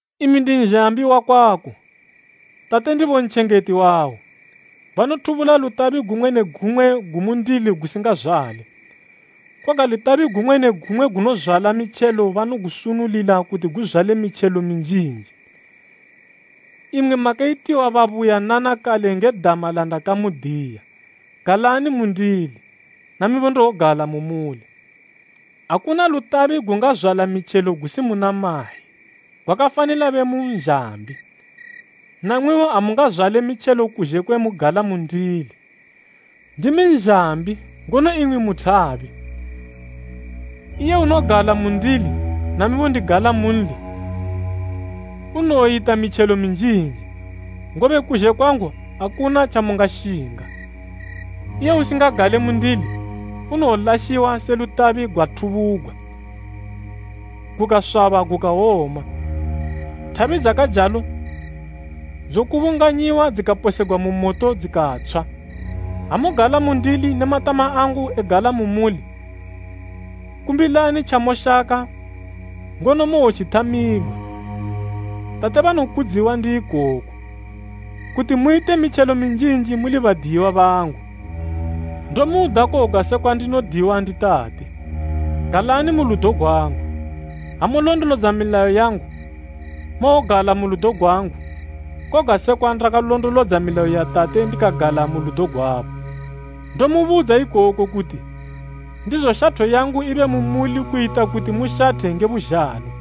“Imi ndi nzhambi wakwako, Tate ndibo ntjengeti wawo. Banothubula lutabi gumwe ne gumwe gumundili gusingazwale, koga lutabi gumwe ne gumwe gunozwala mitjelo banogusunulila kuti guzwale mitjelo minjinji. Imwi makayitiwa babuyanana kale nge dama landakamudiya. Galani mundili, namibo ndowogala mu muli. Akuna lutabi gungazwala mitjelo gusi muna mayi, gwakafanila be mu nzhambi. Namwibo amungazwale mitjelo kuzhe kwe mugala mundili. “Ndimi nzhambi ngono imwi mu thabi. Iye unogala mundili namibo ndigala munli, unowoyita mitjelo minjinji, ngobe kuzhe kwangu akuna tjamungashinga. Iye usingagale mundili, unowolashiwa se lutabi gwathubugwa, gukaswaba gukawoma. Thabi dzakajalo dzokubunganyiwa dzikaposegwa mu moto dzikatshwa. Ha mugala mundili ne matama angu egala mu muli, kumbilani tjamushaka ngono mowotjithamigwa. Tate banokudziwa ndi ikoku, kuti muyite mitjelo minjinji muli badiyiwa bangu. Ndomuda koga sekwa ndinodiwa ndi Tate. Galani mu ludo gwangu. Ha mulondolodza milayo yangu, mowogala mu ludo gwangu koga sekwa ndakalondolodza milayo ya Tate ndikagala mu ludo gwabo. “Ndomubudza ikoku kuti ndizo shatho yangu ibe mu muli kuyita kuti mushathe nge buzhalo.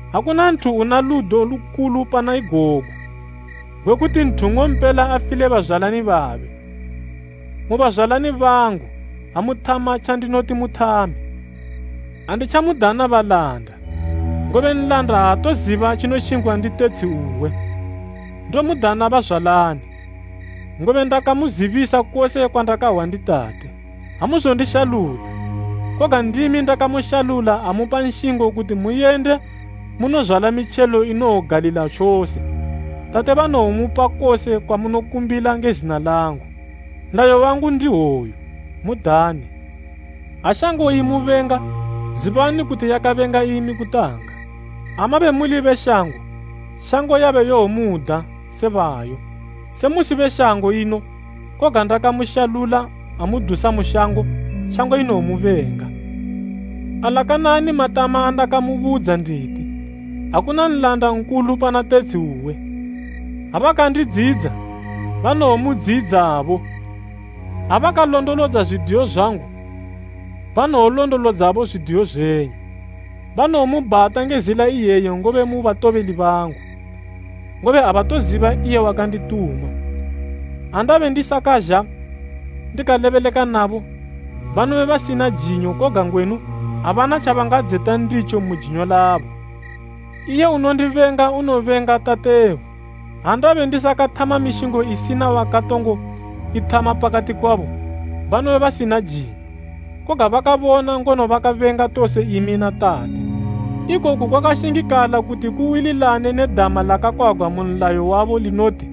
Akuna nthu una ludo lukulu pana igogu, gwe kuti nthu nng'ompela afile bazwalani babe. Mu bazwalani bangu ha muthama tjandinoti muthame. Anditjamudana balanda, ngobe nlanda aatoziba tjinoshingwa ndi tetshi uwe. Ndomudana bazwalani, ngobe ndakamuzibisa kose kwandakahwa ndi Tate. Amuzondishalula, koga ndimi ndakamushalula amupa nshingo kuti muyende munozwala mitjelo inowogalila tjose. Tate banowomupa kose kwamunokumbila nge zina langu. Nlayo wangu ndi hwoyu, mudane. “Ha shango imubenga, zibani kuti yakabenga imi kutanga. Ha mabe muli be shango, shango yabe yomuda se bayo. Se musi be shango ino, koga ndakamushalula amudusa mu shango, shango inomubenga. Alakanani matama andakamubudza nditi, ‘Akuna nlanda nkulu pana tetshi uwe.’ Ha bakandidziyidza banowomudziyidzabo. Ha bakalondolodza zwidiyo zwangu, banowolondolodzabo zwidiyo zwenyu. Banowomubhata nge zila iyeyi ngobe mu batobeli bangu, ngobe abatoziba iye wakandituma. Ha ndabe ndisakazha ndikalebeleka nabo, banobe basina jinyo; koga ngwenu abana tjabangadzeta nditjo mu jinyo labo. Iye unondibenga unobenga Tatebo. Ha ndabe ndisakathama mishingo isina wakatongo ithama pakati kwabo, banobe basina jinyo; koga bakabona ngono bakabenga tose imi na Tate. Ikoku kwakashingikala kuti kuwililane ne dama lakakwagwa mu nlayo wabo, linoti,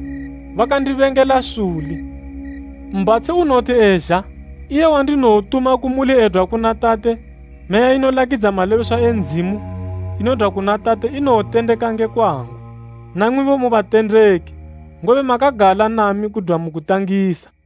‘Bakandibengela suli.’ “Mbhatshi unowoti ezha, iye wandinowotuma kumuli edwa kuna Tate, Meya inolakidza malebeswa e Ndzimu, inodwa kuna Tate inowotendeka nge kwangu. Namwibo mu batendeki, ngobe makagala nami kudwa mu kutangisa.